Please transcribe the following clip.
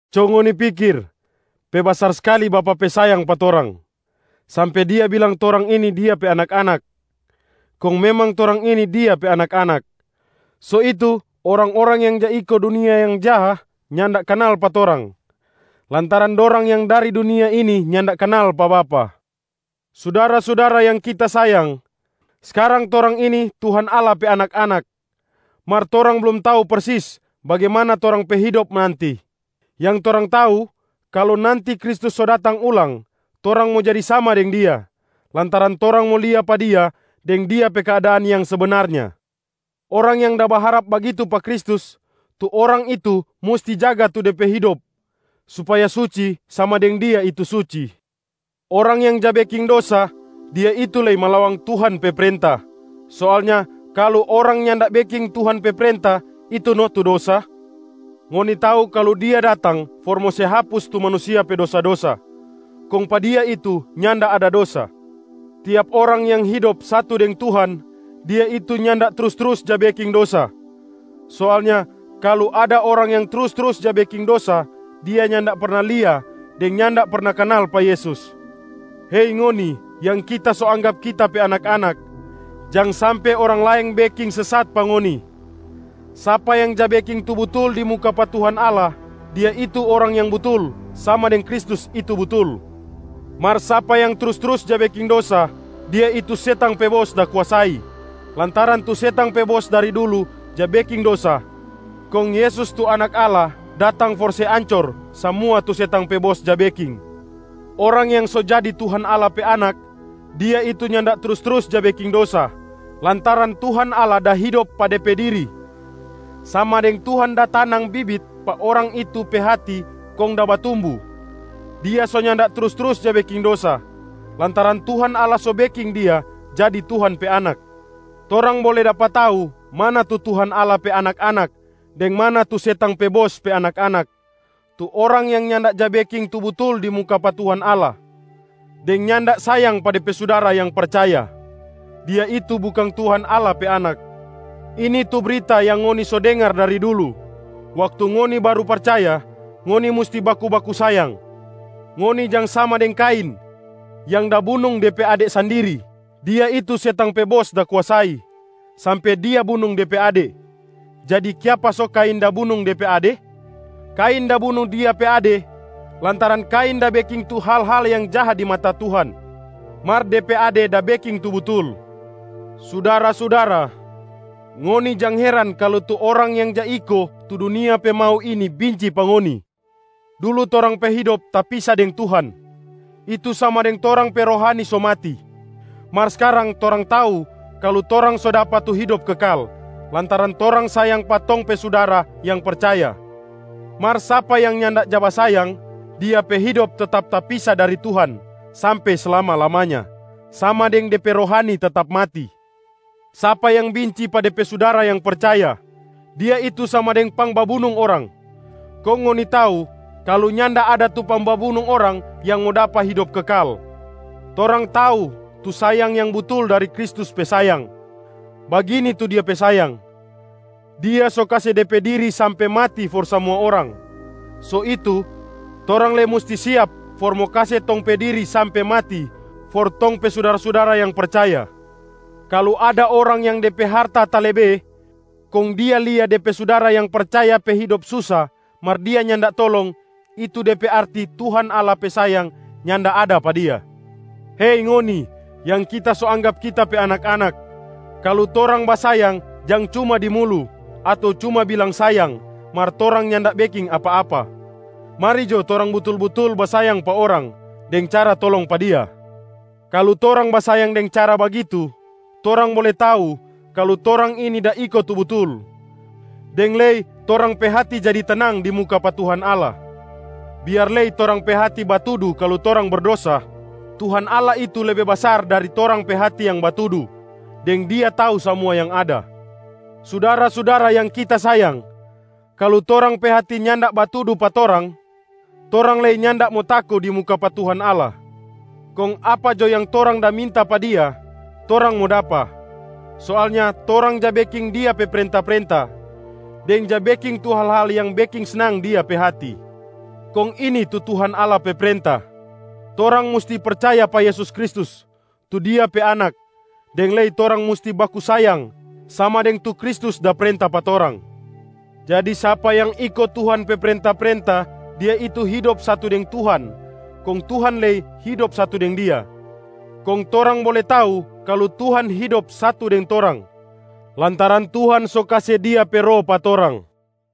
Co ngoni pikir, pe basar skali Bapa pe sayang pa torang, sampe Dia bilang torang ini Dia pe anak-anak, kong memang torang ini Dia pe anak-anak. So itu, orang-orang yang ja iko dunia yang jaha nyanda kanal pa torang lantaran dorang yang dari dunia ini nyanda kanal pa Bapa. Sudara-sudara yang kita sayang, skarang torang ini Tuhan Allah pe anak-anak, mar torang blum tau persis bagimana torang pe hidop nanti. Yang torang tau, kalu nanti Kristus so datang ulang, torang mo jadi sama deng Dia, lantaran torang mo lia pa Dia deng Dia pe keadaan yang sebenarnya. Orang yang da baharap bagitu pa Kristus, tu orang itu musti jaga tu de pe hidop supaya suci sama deng Dia itu suci. Orang yang ja beking dosa, dia itu lei malawang Tuhan pe prenta. Soalnya kalu orang nyanda beking Tuhan pe prenta, itu no tu dosa. Ngoni tau kalu Dia datang for mo se hapus tu manusia pe dosa-dosa, kong pa Dia itu nyanda ada dosa. Tiap orang yang hidop satu deng Tuhan, dia itu nyanda trus-trus ja beking dosa. Soalnya kalu ada orang yang trus-trus ja beking dosa, dia nyanda perna lia deng nyanda perna kanal pa Yesus. Hei ngoni yang kita so anggap kita pe anak-anak, jang sampe orang laeng beking sesat pa ngoni. Sapa yang ja beking tu butul di muka pa Tuhan Allah, dia itu orang yang butul sama deng Kristus itu butul. Mar sapa yang trus-trus ja beking dosa, dia itu setang pe bos da kuasai, lantaran tu setang pe bos dari dulu ja beking dosa. Kong Yesus tu Anak Allah datang for se ancor samua tu setang pe bos ja beking. Orang yang so jadi Tuhan Allah pe anak, dia itu nyanda trus-trus ja beking dosa lantaran Tuhan Allah da hidop pa de pe diri, sama deng Tuhan da tanang bibit pa orang itu pe hati kong da batumbu. Dia so nyanda trus-trus ja beking dosa, lantaran Tuhan Allah so beking dia jadi Tuhan pe anak. Torang bole dapa tau mana tu Tuhan Allah pe anak-anak deng mana tu setang pe bos pe anak-anak. Tu orang yang nyanda ja beking tu butul di muka pa Tuhan Allah deng nyanda sayang pa de pe sudara yang percaya, dia itu bukang Tuhan Allah pe anak. Ini tu brita yang ngoni so dengar dari dulu waktu ngoni baru percaya: ngoni musti baku-baku sayang. Ngoni jang sama deng Kain yang da bunung de pe ade sandiri. Dia itu setang pe bos da kuasai, sampe dia bunung de pe ade. Jadi kiapa so Kain da bunung de pe ade? Kain da bunung dia pe ade lantaran Kain da beking tu hal-hal yang jaha di mata Tuhan, mar de pe ade da beking tu butul. Sudara-sudara, ngoni jang heran kalu tu orang yang ja iko tu dunia pe mau ini binci pa ngoni. Dulu torang pe hidop tapisa deng Tuhan, itu sama deng torang pe rohani so mati. Mar skarang torang tau kalu torang so dapa tu hidop kekal lantaran torang sayang pa tong pe sudara yang percaya. Mar sapa yang nyanda ja basayang, dia pe hidop tetap tapisa dari Tuhan sampe slama-lamanya, sama deng de pe rohani tetap mati. Sapa yang binci pa de pe sudara yang percaya, dia itu sama deng pangbabunung orang. Kong ngoni tau kalu nyanda ada tu pangbabunung orang yang mo dapa hidop kekal. Torang tau tu sayang yang butul dari Kristus pe sayang. Bagini tu Dia pe sayang: Dia so kase De pe diri sampe mati for samua orang. So itu torang lei musti siap for mo kase tong pe diri sampe mati for tong pe sudara-sudara yang percaya. Kalu ada orang yang de pe harta talebe, kong dia lia de pe sudara yang percaya pe hidop susa mar dia nyanda tolong, itu de pe arti Tuhan Allah pe sayang nyanda ada pa dia. Hei ngoni yang kita so anggap kita pe anak-anak, kalu torang basayang, jang cuma di mulu ato cuma bilang sayang mar torang nyanda beking apa-apa. Mari jo torang butul-butul basayang pa orang deng cara tolong pa dia. Kalu torang basayang deng cara bagitu, torang bole tau kalu torang ini da iko tu butul, deng lei torang pe hati jadi tenang di muka pa Tuhan Allah, biar lei torang pe hati batudu kalu torang berdosa, Tuhan Allah itu lebe basar dari torang pe hati yang batudu, deng Dia tau samua yang ada. Sudara-sudara yang kita sayang, kalu torang pe hati nyanda batudu pa torang, torang lei nyanda mo tako di muka pa Tuhan Allah. Kong apa jo yang torang da minta pa Dia, torang mo dapa. Soalnya torang ja beking Dia pe prenta-prenta, deng ja beking tu hal-hal yang beking snang Dia pe hati. Kong ini tu Tuhan Allah pe prenta: torang musti percaya pa Yesus Kristus tu Dia pe Anak, deng lei torang musti baku sayang sama deng tu Kristus da prenta pa torang. Jadi sapa yang iko Tuhan pe prenta-prenta, dia itu hidop satu deng Tuhan kong Tuhan lei hidop satu deng dia. Kong torang bole tau kalu Tuhan hidop satu deng torang, lantaran Tuhan so kase Dia pe Roh pa torang.